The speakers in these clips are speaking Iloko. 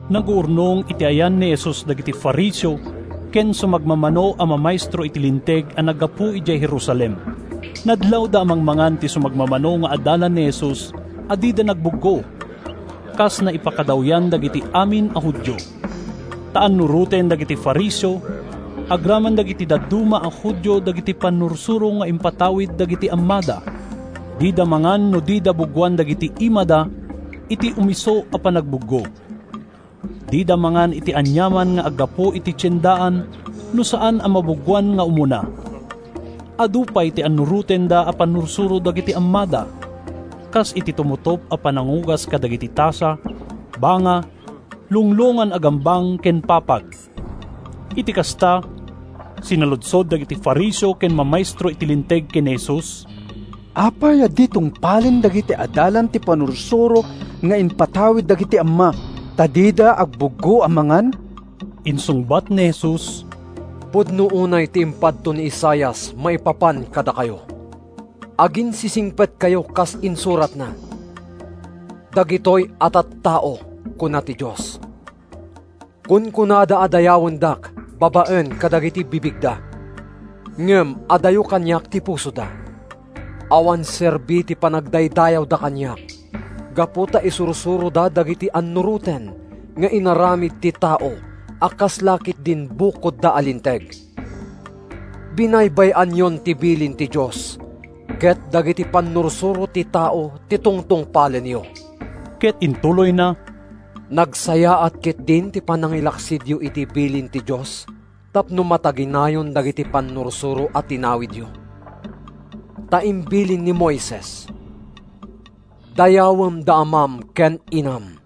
Naguurnong iti ayan ni Jesus dagiti Fariseo ken sumagmamano a mamaestro iti Linteg a naggapu idiay Jerusalem. Nadlawda a mangmangan ti sumagmamano nga adalan ni Jesus a dida nagbuggo, kas naipakadawyan dagiti amin a Judio. ( Ta annuroten dagiti Fariseo, agraman dagiti dadduma a Judio dagiti pannursuro nga impatawid dagiti ammada. Dida mangan no dida buggoan dagiti imada iti umisu a panagbuggo. Dida mangan iti aniaman nga aggapu iti tiendaan no saan a mabuggoan nga umuna. Adu pay ti annurotenda a pannursuro dagiti ammada, kas iti tumutop a panangugas kadagiti tasa, banga, lunglongan a gambang ken papag.) Iti kasta, sinaludsod dagiti Fariseo ken mamaestro iti Linteg ken ni Jesus, “Apay a di tungpalen dagiti adalam ti pannursuro nga impatawid dagiti amma, ta dida agbuggo a mangan?” Insungbat ni Jesus, “Pudno unay ti impadto ni Isaias maipapan kadakayo! Aginsisingpetkayo kas insuratna, ‘Dagitoy a tattao,’ kuna ti Dios, ‘kunkunada a dayawendak babaen kadagiti bibigda. Ngem adayo kaniak ti pusoda. Awan serbi ti panagdaydayawda kaniak, gapu ta isursuroda dagiti annuroten nga inaramid ti tao a kasla ketdin bukodko a linteg.’ “Binaybay-anyon ti bilin ti Dios ket dagiti pannursuro ti tao ti tungtungpalenyo.” Ket intuloyna, “Nagsayaat ketdin ti panangilaksidyo iti bilin ti Dios tapno mataginayon dagiti pannursuro a tinawidyo. Ta imbilin ni Moises, ‘Dayawem da amam ken inam,’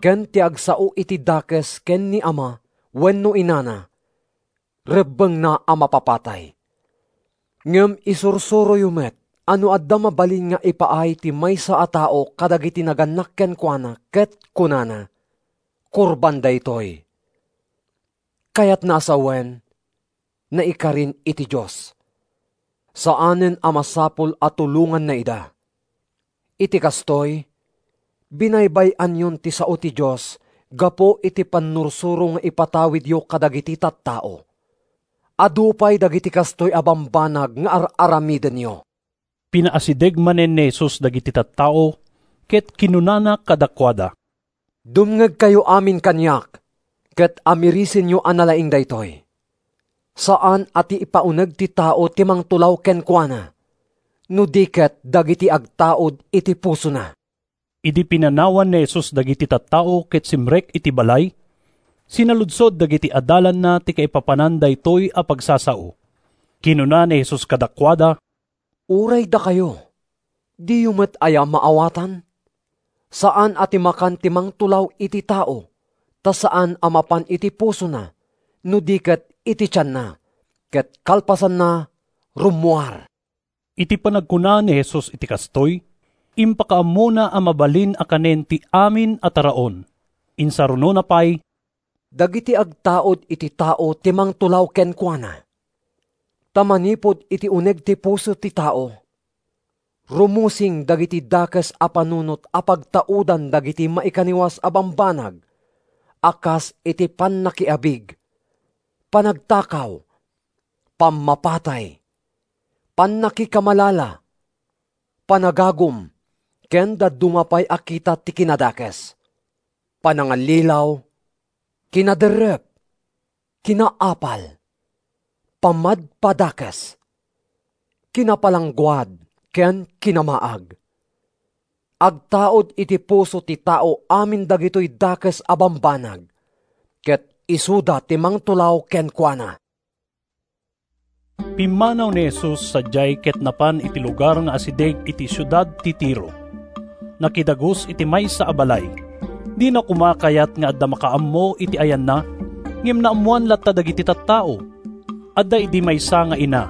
ken ‘Ti agsao iti dakes ken ni ama wenno inana rebbengna a mapapatay.’ Ngem isursuroyo met a no adda mabalin nga ipaay ti maysa a tao kadagiti nagannak kenkuana ket kunana, ‘Korban daytoy’ (kayatna a sawen, “Naikarin iti Dios”), saanen a masapul a tulonganna ida. Iti kastoy, binaybay-anyon ti sao ti Dios gapu iti pannursuro nga ipatawidyo kadagiti tattao. Adu pay dagiti kastoy a bambanag nga ar-aramidenyo.” Pinaasideg manen ni Jesus dagiti tattao ket kinunana kadakuada: “Dumngegkayo amin kaniak ket amirisenyo a nalaing daytoy. Saan a ti ipauneg ti tao ti mangtulaw kenkuana, no di ket dagiti agtaud iti pusona.” Idi pinanawan ni Jesus dagiti tattao ket simrek iti balay, sinaludsod dagiti adalanna ti kaipapanan daytoy a pagsasao. Kinuna ni Jesus kadakuada, “Uray dakayo, diyo met aya maawatan? Saan a ti makan ti mangtulaw iti tao, ta saan a mapan iti pusona no di ket iti tianna ket kalpasanna rummuar.” (Iti panagkuna ni Jesus iti kastoy, impakaammona a mabalin a kanen ti amin a taraon.) Insarunona pay, “Dagiti agtaud iti tao ti mangtulaw kenkuana. Ta manipud iti uneg ti puso ti tao, rumusing dagiti dakes a panunot a pagtaudan dagiti maikaniwas a bambanag a kas iti pannakiabig, panagtakaw, pammapatay, pannakikamalala, panagagum ken dadduma pay a kita ti kinadakes; panangallilaw, kinaderrep, kinaapal, pammadpadakes, kinapalangguad ken kinamaag. “Agtaud iti puso ti tao amin dagitoy dakes a bambanag, ket isuda ti mangtulaw kenkuana.” Pimmanaw ni Jesus sadiay ket napan iti lugar nga asideg iti siudad ti Tiro. Nakidagus iti maysa a balay. Dina koma kayat nga adda makaammo iti ayanna, ngem naammoan latta dagiti tattao. Adda idi maysa nga ina.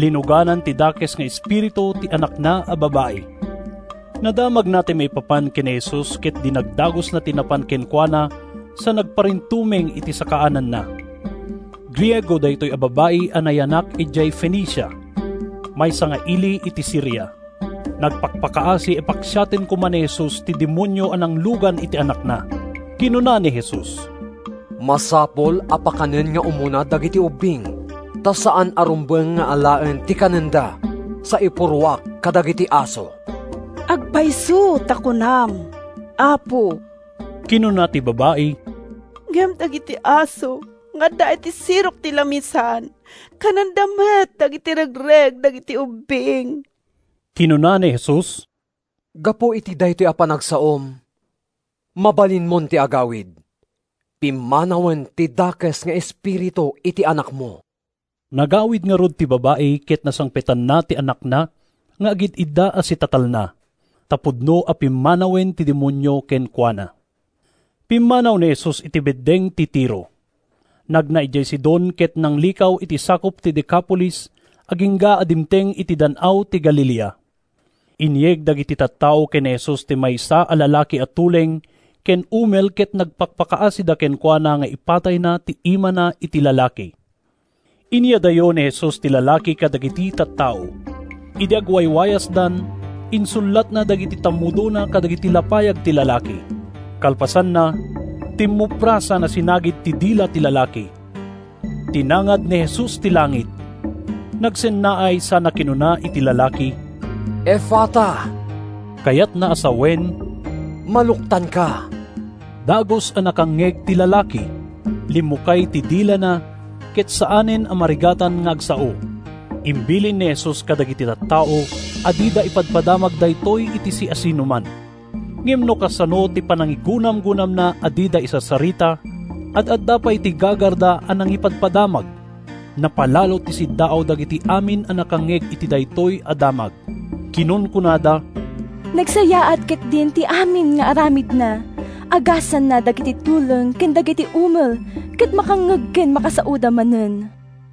Linuganan ti dakes nga espiritu ti anakna a babai. Nadamagna ti maipapan ken ni Jesus ket dinagdagusna ti napan kenkuana sa nagparintumeng iti sakaananna. Griego daytoy a babai a nayanak idiay Fenicia, maysa nga ili iti Siria. Nagpakpakaasi a paksiaten koma ni Jesus ti demonio a nanglugan iti anakna. Kinuna ni Jesus, “Masapul a pakanen nga umuna dagiti ubbing ta saan a rumbeng nga alaen ti kanenda sa ipurruak kadagiti aso.” “Agpayso ta kunam, Apo,” kinuna ti babai, “ngem dagiti aso nga adda iti sirok ti lamisaan kanenda met dagiti regreg dagiti ubbing.” Kinuna ni Jesus, “Gapu iti daytoy a panagsaom, mabalinmon ti agawid. Pimmanawen ti dakes nga espiritu iti anakmo!” Nagawid ngarud ti babai ket nasangpetanna ti anakna nga agid-idda a sitatalna, ta pudno a pimmanawen ti demonio kenkuana. Pimmanaw ni Jesus iti beddeng ti Tiro. Nagna idiay Sidon ket nanglikaw iti sakup ti Decapolis agingga a dimteng iti Dan-aw ti Galilea. Inyeg dagiti tattao ken ni Jesus ti maysa a lalaki a tuleng ken umel ket nagpakpakaasida kenkuana nga ipatayna ti imana iti lalaki. Inyadayo ni Jesus ti lalaki kadagiti tattao. Idi agwaywayasdan insullatna dagiti tammudona kadagiti lapayag ti lalaki. Kalpasanna, timmupra sana sinagid ti dila ti lalaki. Tinangad ni Jesus ti langit, nagsennaay sana kinuna iti lalaki, “Efata,” (kayatna a sawen, “Maluktanka”). Dagus a nakangngeg ti lalaki, limmukay ti dilana ket saanen a marigatan nga agsao. Imbilin ni Jesus kadagiti tattao a dida ipadpadamag daytoy iti siasinoman; ngem no kasano ti panangigunamgunamna a dida isarsarita, ad-adda pay ti gagarda a nangipadpadamag. Napalalo ti siddaaw dagiti amin a nakangngeg iti daytoy a damag. Kinunkunada, “Nagsayaat ketdin ti amin nga aramidna! Agasanna dagiti tuleng ken dagiti umel ket makangngeg ken makasaoda manen.”